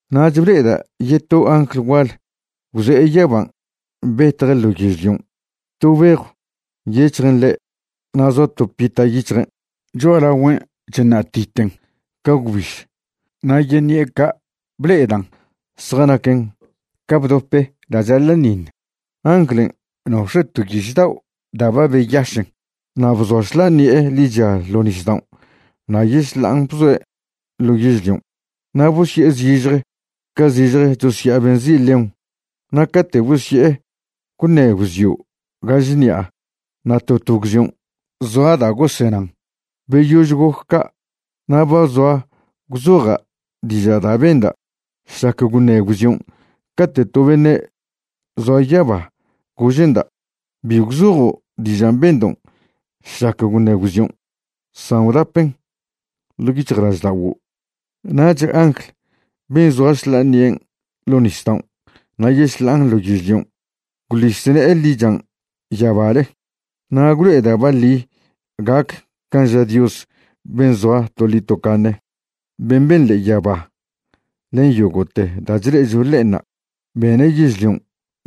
Nach ble'eda' yeto angl gual gwze'e yaban' betje' ḻo yežlion'. To bejw nyec̱hjen ḻe' na' zoa to pita' yic̱hjen'. Cho'alagüen' chṉa'titen ca gwbiž, na' yeṉi'e ca' ble'edan' zjanaquen ca bdope da' chaḻa'ṉiṉ. Anglen' nox̱e' to yiš dao' da' ba beyašen. Na' bzoa šḻa'a ṉi'e ḻicha ḻo nisdaon' na' yešḻa'an bzoe' ḻo yežlion'. Na' bosye'e zižje ca zižje chosya'a be nzi' león. Na' cate' bosye'e gwṉe gwzio' gaž ṉi'a na' to to gwzion' zoa da' gosenan. Beyož goc ca' na' ba zoa gwzoja' diža' da' benda' šlac gwṉe gwzion' cate' to beṉe' zoa yaba gože'nda': ―Bi gwzojo' dižan' bendo' šlac gwṉe gwzion', san gwdapen ḻo' yic̱hjlažda'oguo'. Nach angl ben' zoa šḻa'a ṉi'en ḻo nisdaon' na' yešḻa'an ḻo yežlion' gwḻis ne'e ḻichan' yabale. Na' gwlo'e da' baḻi gac can' ža Dios ben' zoa toḻi tocaṉe, ben' ben ḻe'e yaba len yogo'te da' chle'echo ḻe'enṉa', bene' yežlion',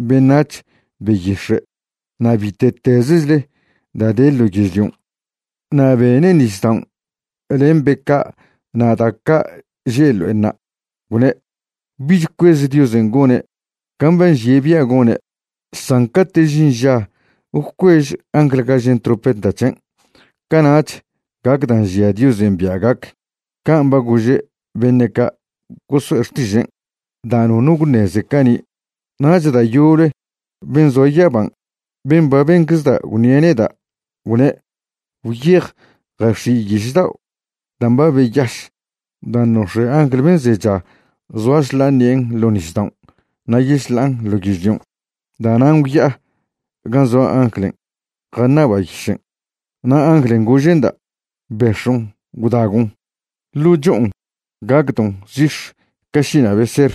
beṉac̱h, beyix̱e', na' bite'tezechle da' de ḻo yežlion', na' bene' nisdaon' len be ca' na' da' ca' že' ḻo'enṉa'. Gwne': ―Bich cuez Diosen' gone' can' ba nžie' bia' gone'. San cate' žin ža gwcuež angl gažen' trompeta c̱hen', cana'ch gac da' nžia Diosen' bia' gac, can' ba gože' beṉe' ca' goso'e xtižen', da' nono gwṉeze cani'. Nach da' yoble ben' zoa yaban' ben' ba benczeda' gwṉie' neda', gwne': ―Gwyej jax̱i' yiš dao' dan' ba beyaš dan' nox̱e' angl ben' zecha zoa šḻa'a ṉi'en ḻo nisdaon' na' yešḻa'an ḻo yežlion'. Da'nan' gwya'a gan' zoa anglen' jaṉaba' yišen'. Na' anglen' gože'nda': ―Bex̱on' gwdagon'. Ḻo' cho'on gacdon' zix̱ ca šina' beser,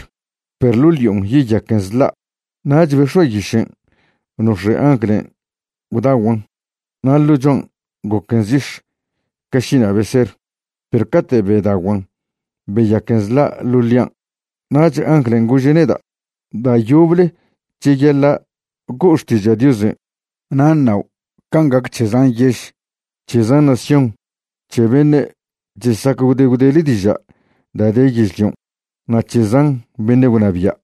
perw ḻo' ḻi'on yeyaquen zḻa'. Nach bex̱oa' yišen' nox̱e' anglen' gwdaguan'. Na' ḻo' cho'an goquen zix̱ ca šina' beser, perw cate' bedaguan' beyaquen zḻa' ḻo' ḻi'an. Nach anglen' gože' neda': ―Da' yoble cheyaḻa' go'o xtiža' Diosen' na' ṉao' can' gac c̱he zan yež, c̱he zan nación, c̱he beṉe' chesac gwde gwdele diža' da' de yežlion', na' c̱he zan beṉe' gwnabia'.